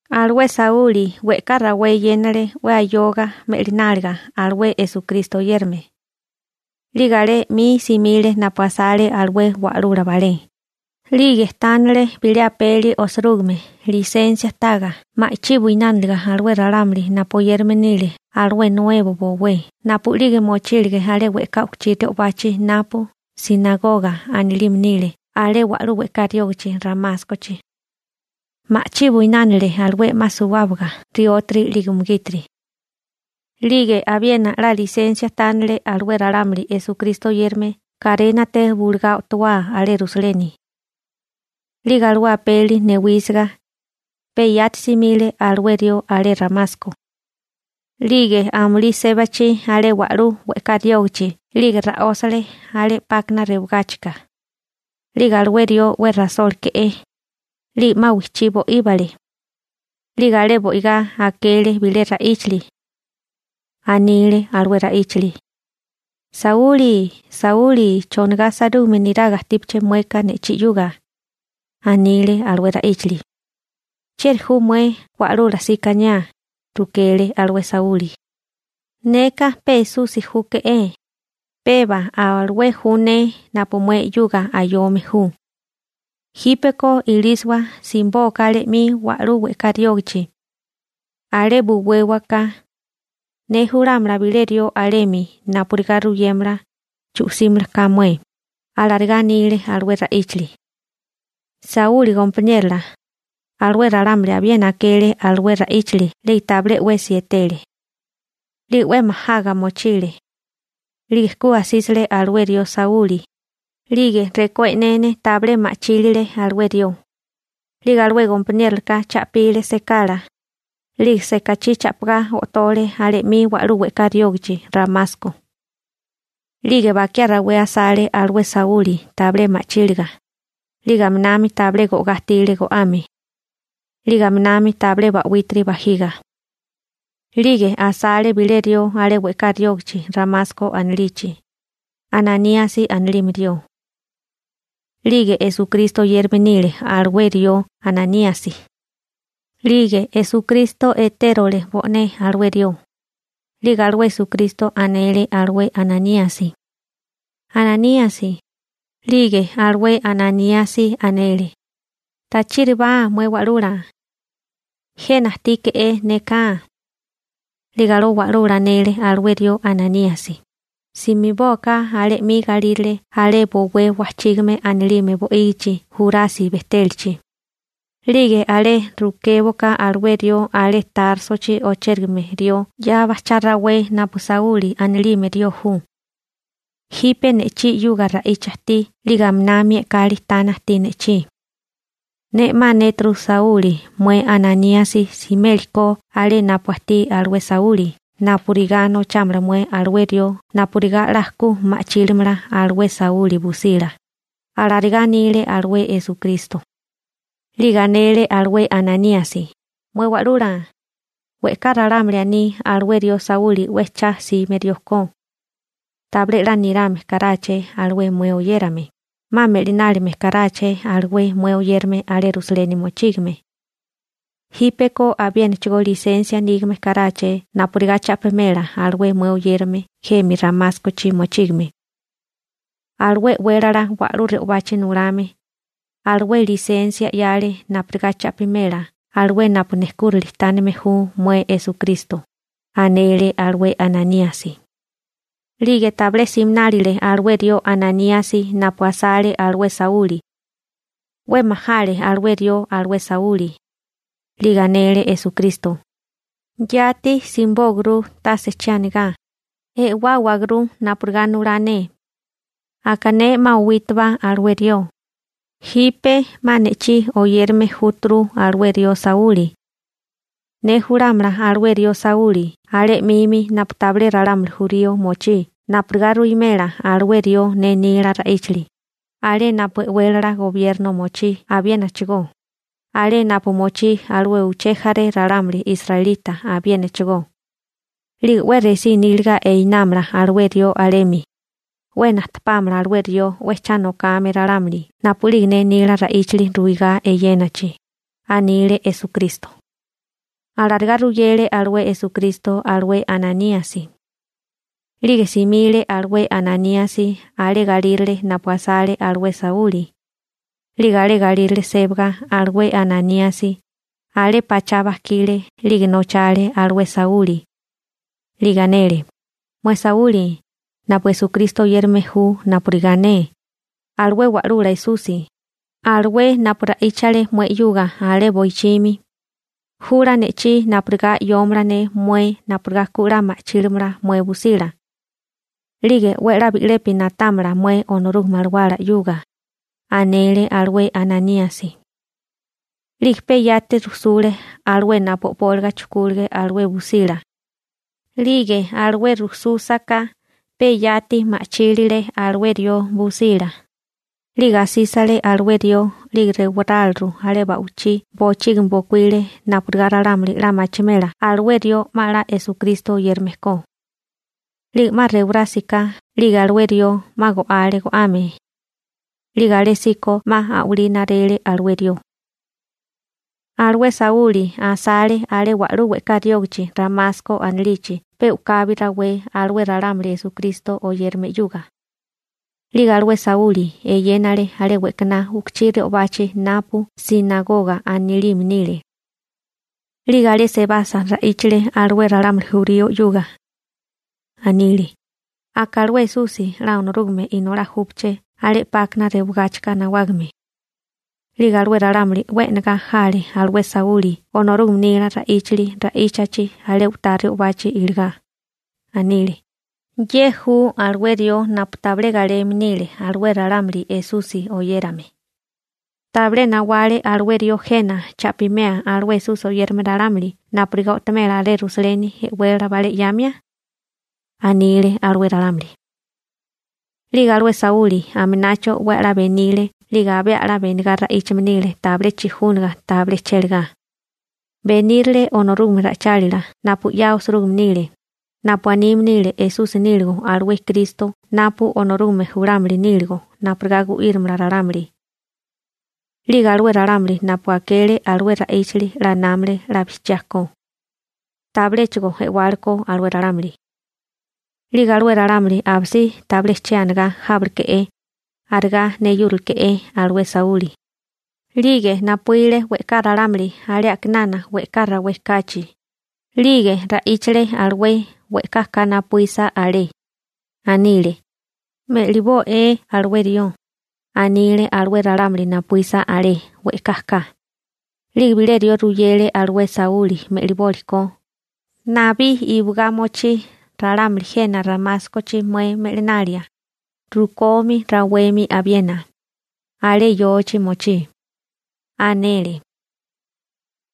Alué Sauli we'ká rawé eyénale 'we ayoga me'lináliga alué Esukristo oyérame. 'Lige alé 'mi simile napu asale alué wa'lula balé, 'lige tánale bilé apeli osirúgime lisensia taga ma'chí buinániliga alué ralámuli napu oyérame nile alué nuebo bowé (Esukristo oyérame) napu'lige mochílige alé we'ká u'kuchí re'obachi napu «sinagoga» anilime nile alé wa'lú we'ká riógichi Ramáskochi. Ma'chí buinánile alué 'ma suwábaga riótiri 'lige umugítiri. 'Lige abiena 'la lisensia tánale alué ralámuli Esukristo oyérame karénate bulugá o'towá alé Rusaleni. 'Lige alué apeli newísiga, pe yati simile alué rió alé Ramasko. 'Lige amulí sébachi alé wa'lú we'ká riógichi 'lige ra'ósale alé 'pákana rewagáchika. 'Lige alué rió 'we rasóleke'é. 'Lige 'ma wijchí bo'íbale. 'Lige alé bo'igá akele bilé ra'íchili. Anile alué ra'íchili: ―Sauli, Sauli chonigá sairúgame niraga ajtípiché mueka ne'chí 'yuga ―anile alué ra'íchili. ―¿Chieri ju mué Wa'lula sikaniá? ―rukele alué Sauli. ―Neka pe Esusi júke'é, pe aba alué ju ne napu mué 'yuga ayome ju. Jípeko ilísiwa simibóká alé 'mi wa'lú we'ká riógichi. Alé buwéwaká, ne julámala bilé rió alemi napurigá ruyémala chu'símiliká mué ―alarigá anile alué ra'íchili. Sauli gompaniérola, alué ralámuli abiena akele alué ra'íchali 'lige tabilé 'wesi etele. 'Lige 'we majaga mochile. 'Lige ku asísile alué rió Sauli. 'Lige rekó e'nene tabilé ma'chílile alué rió. 'Lige alué gompaniérolaka cha'pile sekala. 'Lige sekachí cha'pigá o'tole alé 'mi wa'lú we'ká riógachi Ramasko. 'Lige bakiá rawé asale alué Sauli tabilé ma'chíliga, 'lige aminami tabilé go'gá ajtile go'ame, 'lige aminami tabilé ba'wítiri bajiga. 'Lige asale bilé rió alé we'ká riógachi Ramasko anilichi, Ananíasi anilime rió. 'Lige Esukristo oyérame nile alué rió Ananíasi. 'Lige Esukristo etérole bo'né alué rió. 'Lige alué Esukristo anele alué Ananíasi: ―¡Ananíasi! 'Lige alué Ananíasi anele: ―Tachíribá, mué Wa'lula. Jena ajtíke'é neka. 'Lige alué Wa'lula anele alué rió Ananíasi: ―Simibóaká alé 'mi galírale alé bowé Wajchígame anilime bo'ígichi Jurasi bejtélachi. 'Lige alé rukéboká alué rió alé Társochi ochérigame rió 'ya bajchá rawé napu Sauli anilime rió ju. Jipe ne'chí 'yuga ra'icha ajtí 'lige aminami e'kali tana ajtí ne'chí. Ne 'ma anéturu Sauli mué Ananíasi simélikó alé napu ajtí alué Sauli napurigá nochámala mué alué rió napurigá 'la ku ma'chílimala alué Sauli busila ―alarigá anile alué Esukristo. 'Lige anele alué Ananíasi: ―Mué Wa'lula, we'ká ralámuli aní alué rió Sauli 'we cha 'sime rió ko. Tabilé 'la nirame karáché alué mué oyérame, 'ma me'linálime karáché alué mué oyérame alé Rusaleni mochígame. Jípeko abiénachigó lisensia nígame karáché napurigá cha'pimela alué mué oyérame jemi Ramáskochi mochígame. Alué e'wélala wa'lú re'obachi nulame, alué lisensia 'yale napurigá cha'pimela alué napu nejkúrali tánime ju mué Esukristo ―anele alué Ananíasi. 'Lige tabilé siminálile alué rió Ananíasi napu asale alué Sauli. 'We majale alué rió alué Sauli. 'Lige anele Esukristo: ―Yati simibóaguru tase che anigá, e'wáwagurú napurigá nulá ne. Aka ne 'ma owítuba alué rió, jipe 'ma ne'chí oyérame júturu alué rió Sauli. Ne julámala alué rió Sauli alé 'mimi napu tabilé ralámuli jurío mochí napurigá ruwimela alué rió ne nila ra'íchali, alé napu e'wélala gobierno mochí abiénachigó, alé napu mochí alué uché jaré ralámuli israelita abiénachigó. 'Lige 'we resí níliga einámala alué rió alemi, 'we najtepámala alué rió 'we cha nokame ralámuli napu'lige ne nila ra'íchali ruigá eyénachi ―anile Esukristo. Alarigá ruyele alué Esukristo alué Ananíasi. 'Lige simile alué Ananíasi alé galírale napu asale alué Sauli. 'Lige alé galírale sébaga alué Ananíasi alé pachá bajkile 'lige nochale alué Sauli. 'Lige anele: ―Mué Sauli napu Esukristo oyérame ju napurigá ne, alué Wa'lula Esusi, alué napu ra'íchale mué 'yuga alé boichimi, jula ne'chí napurigá 'yóomala ne mué napurigá ku 'la ma'chílimala mué busila. 'Lige 'we a'lá bi'lepi na'támala mué Onorúgame Alawala 'yuga ―anele alué Ananíasi. 'Lige pe yati rujsule alué napu o'póliga chujkúlige alué busila. 'Lige alué rujsúsaká pe yati ma'chílile alué rió busila. 'Lige asísile alué rió 'lige rewaráliru alé ba'wichí bochígimi bokuíle napurigá ralámuli 'la machimela alué rió 'ma 'la Esukristo oyérame ko. 'Lige 'ma rewarásiká 'lige alué rió 'ma go'ale go'ame. 'Lige alésíko 'ma a'walí narele alué rió. Alué Sauli asale alé wa'lú we'ká riógichi Ramasko anilichi pe u'kabi rawé alué ralámuli Esukristo oyérame 'yuga. 'Lige alué Sauli eyénale alé we'kaná u'kuchí re'obachi napu «sinagoga» anilime nile. 'Lige alé sebasa ra'íchale alué ralámuli jurío 'yuga. Anile: ―Aka alué Esusi 'la Onorúgame Inolá júpaché alé 'pákana rewagáchika nawágame. 'Lige alué ralámuli 'we e'negá jale alué Sauli Onorúgame nila ra'íchali ra'íchachi alé u'tá re'obachi iligá. Anile: ―¿Ye ju alué rió napu tabilé galeme nile alué ralámuli Esusi oyérame? ¿Tabilé nawale alué rió jena cha'pimea alué Esusi oyérame ralámuli napurigá o'tomela alé Rusaleni e'wélala balé 'yamia? ―anile alué ralámuli. 'Lige alué Sauli aminacho 'we a'lá benile 'lige abé a'lá benigá ra'íchame nile tabilé chijúnaga tabilé chélagá. Benírile Onorúgame ra'ichálila napu 'ya osirúgime nile, napu anime nile Esusi níligo alué Kristo napu Onorúgame julámili níligo napurigá gu'írimala ralámuli. 'Lige alué ralámuli napu akele alué ra'íchali 'la námale 'la bijchiá ko, tabiléchigo e'wale ko alué ralámuli. 'Lige alué ralámuli abisí tabilé che anigá jábaleke'é. Arigá neyúrileke'é alué Sauli. 'Lige napuíle we'ká ralámuli alé a'kinana we'ká rawé kachi. 'Lige ra'íchale alué we'ká ka napuísa alé. Anile: ―Me'libó'é alué rió ―anile alué ralámuli napuísa alé we'ká ka. 'Lige bilé rió ruyele alué Sauli me'libólikó: ―Nabí iwigá mochí ralámuli jena Ramáskochi mué me'linalia, rukomi rawemi abiena, alé yochi mochí ―anele.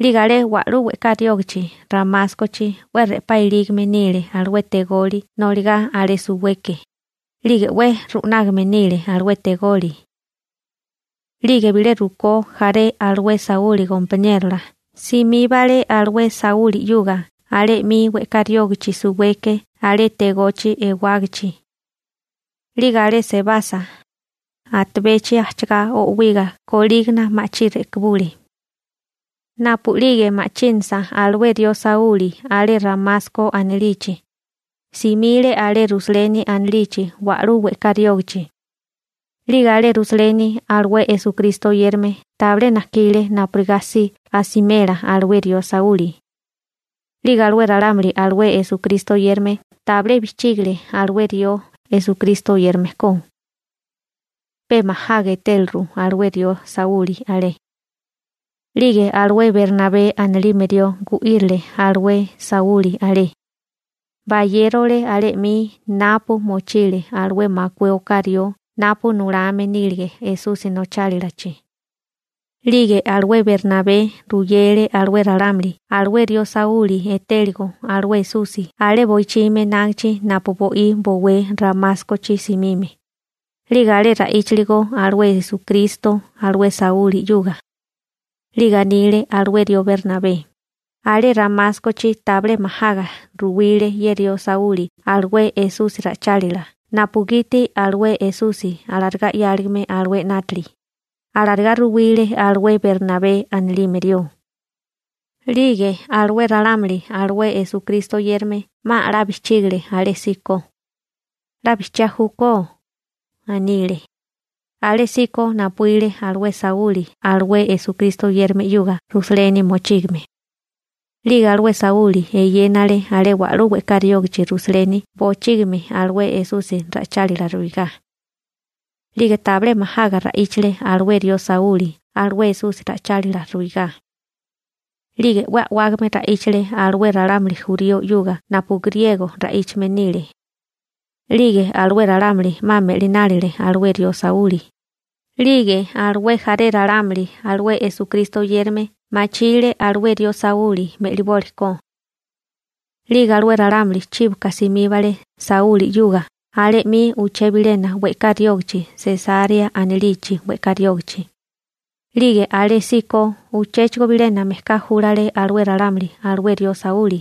'Lige alé wa'lú we'ká riógachi Ramáskochi 'we re'pá ilígame nile alué tegoli noligá alé suweke, 'lige 'we ru'nágame nile alué tegoli. 'Lige bilé rukó jaré alué Sauli gompaniérola simíbale alué Sauli 'yuga alé 'mi we'ká riógachi suweke alé tegochi ewágachi. 'Lige alé sebasa, atabechi ajchagá o'wiga kolígana ma'chí re'kibule. Napu'lige ma'chínasa alué rió Sauli alé Ramasko anilichi, simile alé Rusaleni anilichi wa'lú we'ká riógachi. 'Lige alé Rusaleni alué Esukristo oyérame tabilé najkile napurigá si asimela alué rió Sauli. 'Lige alué ralámuli alué Esukristo oyérame tabilé bijchígale alué rió Esukristo oyérame ko. Pe majaga etéleru alué rió Sauli alé. 'Lige alué Bernabé anilime rió gu'írile alué Sauli alé. Bayérole alé 'mi napu mochile alué makué oká rió napu nulame nílige Esusi nochálilachi. 'Lige alué Bernabé ruyele alué ralámuli alué rió Sauli etéligo alué Esusi alé boichimi enágichi napu bo'í bowé Ramáskochi simime, 'lige alé ra'íchiligo alué Esukristo alué Sauli 'yuga. 'Lige anile alué rió Bernabé: ―Alé Ramáskochi tabilé majaga ruwile ye rió Sauli alué Esusi ra'ichálila napugiti alué Esusi alarigá 'yáligame alué 'nátili ―alarigá ruwile alué Bernabé anilime rió. 'Lige alué ralámuli alué Esukristo oyérame 'ma a'lá bijchígale alésíko. ―'La bijchiá júkó ―anile. Alésíko napuíle alué Sauli alué Esukristo oyérame 'yuga Rusaleni mochígame. 'Lige alué Sauli eyénale alé wa'lú we'ká riógichi Rusaleni bochígimi alué Esusi ra'ichálila ruigá. 'Lige tabilé majaga ra'íchale alué rió Sauli alué Esusi ra'ichálila ruigá. 'Lige 'we a'wágame ra'íchale alué ralámuli jurío 'yuga napu griego ra'íchame nile. 'Lige alué ralámuli 'ma me'linálele alué rió Sauli. 'Lige alué jaré ralámuli alué Esukristo oyérame machile alué rió Sauli me'liboli ko. 'Lige alué ralámuli chíboka simíbale Sauli 'yuga alé 'mi uché bilena we'ká riógichi Sesarea anilichi we'ká riógichi. 'Lige alésíko uchéchigo bilena mejká júlale alué ralámuli alué rió Sauli.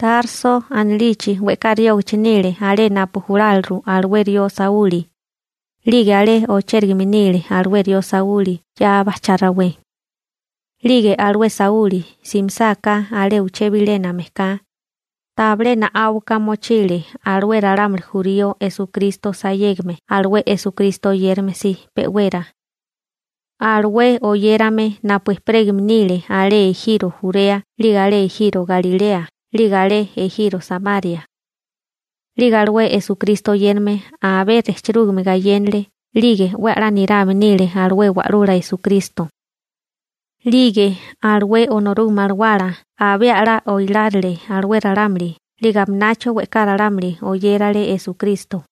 Tarso anilichi we'ká riógichi nile alé napu juláliru alué rió Sauli. 'Lige alé ochérigame nile alué rió Sauli 'ya bajchá rawé. 'Lige alué Sauli simisáká alé uché bilena mejká, tabilé na'áuka mochile alué ralámuli jurío Esukristo sayégame alué Esukristo oyérame si pe'wera, alué oyérame napu ejperégame nile alé ejiro Jurea 'lige alé ejiro Galilea 'lige alé ejiro Samaria. 'Lige alué Esukristo oyérame abé rejchirúgame gayénale 'lige 'we a'lá nirame nile alué Wa'lula Esukristo. 'Lige alué Onorúgame Alawala abé a'lá oilárile alué ralámuli 'lige aminacho we'ká ralámuli oyérale Esukristo.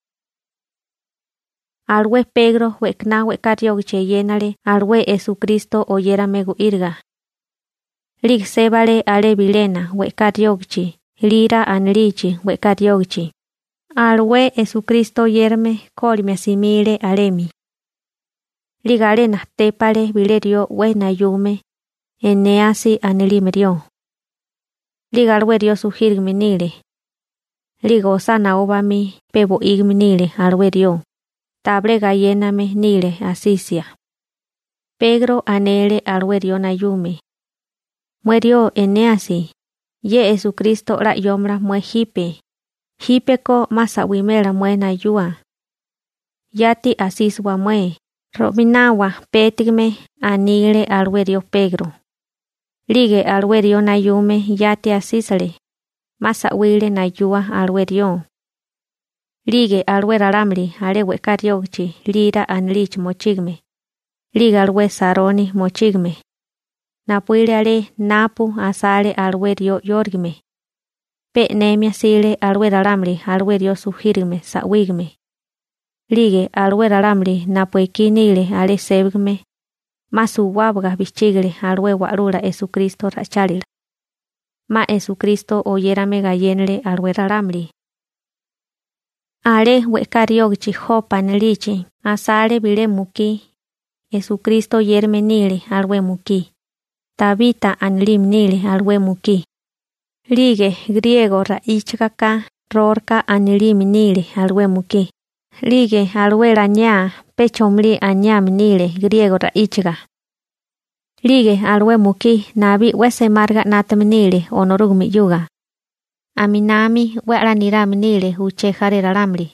Alué Pegro we'kaná we'ká riógichi eyénale alué Esukristo oyérame gu'íriga. 'Lige sébale alé bilena we'ká riógichi Lira anilichi we'ká riógichi, alué Esukristo oyérame kólimia simile alemi. 'Lige alé najtépale bilé rió 'we nayume, Enéasi anilime rió. 'Lige alué rió sujírigame nile. 'Lige osá naó bamí pe bo'ígime nile alué rió, tabilé gayéname nile asisia. Pegro anele alué rió nayume: ―Mué rió Enéasi, ye Esukristo 'la 'yómala mué jipe, jípeko 'ma sa'wimela mué nayua. Yati asísiwa mué, ro'minawa pétigame ―anile alué rió Pegro. 'Lige alué rió nayume yati asísile, 'ma sa'wile nayua alué rió. 'Lige alué ralámuli alé we'ká riógichi Lira anilichi mochígame, 'lige alué Saroni mochígame, napuíle alé napu asale alué rió 'yórigame. Pe e'nemia jsile alué ralámuli alué rió sujírigame sa'wígame. 'Lige alué ralámuli napu ekí nile alé sébagame, 'ma suwábaga bijchígale alué Wa'lula Esukristo ra'ichálila. 'Ma Esukristo oyérame gayénale alué ralámuli. Alé we'ká riógichi Jopa anilichi asale bilé mukí, Esukristo oyérame nile alué mukí, Tabita anilime nile alué mukí. 'Lige griego ra'íchaga ka Rorka anilime nile alué mukí. 'Lige alué laniá pe chomalí aniame nile griego ra'íchaga. 'Lige alué mukí nabí 'we semáriga 'nátame nile Onorúgame 'yuga. Aminami 'we a'lá nirame nile uché jaré ralámuli,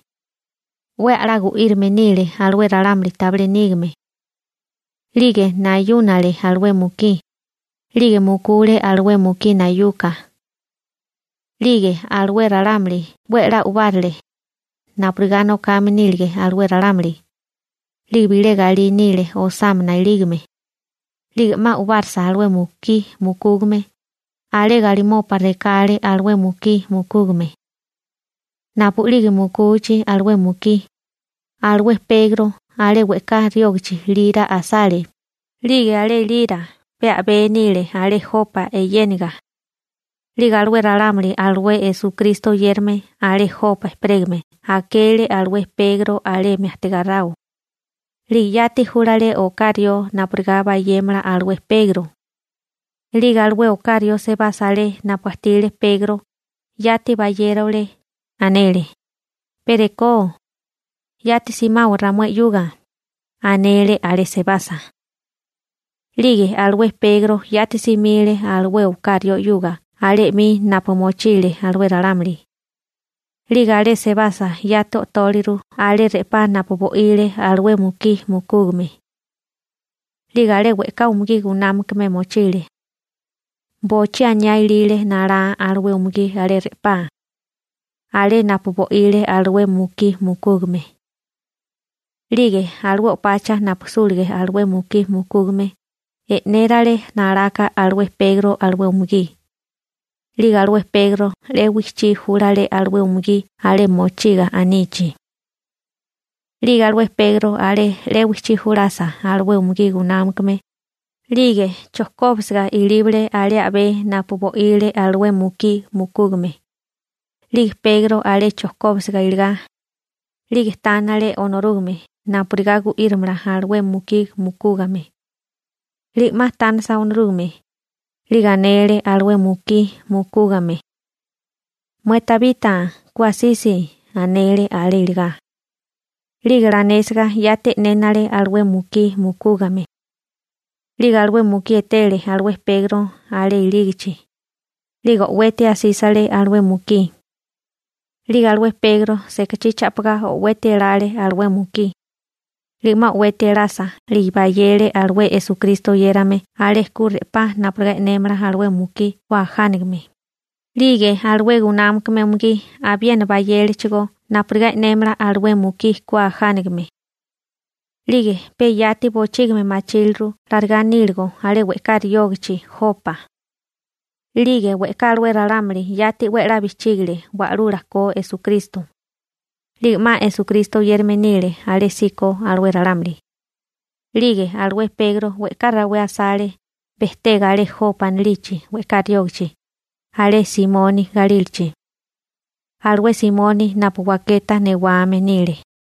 'we a'lá gu'írame nile alué ralámuli tabilé nígame. 'Lige nayúnale alué mukí, 'lige mukule alué mukí nayuka. 'Lige alué ralámuli 'we a'lá u'bárele, napurigá nokame nílige alué ralámuli. 'Lige bilé galí nile osámana ilígame. 'Lige 'ma u'barsa alué mukí mukúgame, alé galimopa rekale alué mukí mukúgame. Napu'lige mukuchi alué mukí, alué Pegro alé we'ká riógichi Lira asale. 'Lige alé Lira pe a'bé nile alé Jopa yéniga. 'Lige alué ralámuli alué Esukristo oyérame alé Jopa ejperégame akele alué Pegro alemi ajtigáráo. 'Lige yati júlale oká rió napurigá bayémala alué Pegro. 'Lige alué oká rió sebasa alé napu ajtile Pegro, yati bayérole, anele: ―Pe rekó, ¡yati simawa ramué 'yuga! ―anele alé sebasa. 'Lige alué Pegro yati simile alué oká rió 'yuga alé 'mi napu mochile alué ralámuli. 'Lige alé sebasa yati o'tóliru alé re'pá napu bo'ile alué mukí mukúgame. 'Lige alé we'ká umugí gunámakame mochile. Bochí aniá ilile nalá alué umugí alé re'pá, alé napu bo'ile alué mukí mukúgame. 'Lige alué o'pacha napu súlige alué mukí mukúgame, e'nérale nalaka alué Pegro alué umugí. 'Lige alué Pegro 'le wichí júlale alué umugí alé mochiga anichi. 'Lige alué Pegro alé 'le wichí julasa alué umugí gunámakame, 'lige chojkóbisiga ilíbale alé a'bé napu bo'ile alué mukí mukúgame. 'Lige Pegro alé chojkóbisiga iligá, 'lige tánele Onorúgame napurigá gu'írimala alué mukí mukúgame. 'Lige 'ma tánesa Onorúgame, 'lige anele alué mukí mukúgame: ―Mué Tabita ku asisi ―anele alé iligá. 'Lige lanésiga yati e'nénele alué mukí mukúgame. 'Lige alué mukí etele alué Pegro alé ilígichi. 'Lige o'weti asísile alué mukí. 'Lige alué Pegro sekachí cha'pigá o'weti elale alué mukí. 'Lige 'ma o'weti elasa 'lige bayele alué Esukristo oyérame alé ku re'pá napurigá e'némala alué mukí ku ajánagame. 'Lige alué gunámakame umugí abiena bayélechigó napurigá e'némala alué mukí ku ajánagame. 'Lige pe yati bochígimi machíleru larigá níligo alé we'ká riógichi Jopa. 'Lige we'ká alué ralámuli yati 'we a'lá bijchígile Wa'lula ko Esukristo. 'Lige 'ma Esukristo oyérame nile alésíko alué ralámuli. 'Lige alué Pegro we'ká rawé asale bejtega alé Jopa anilichi we'ká riógachi alé Simoni galílachi, alué Simoni napu waketa newame nile.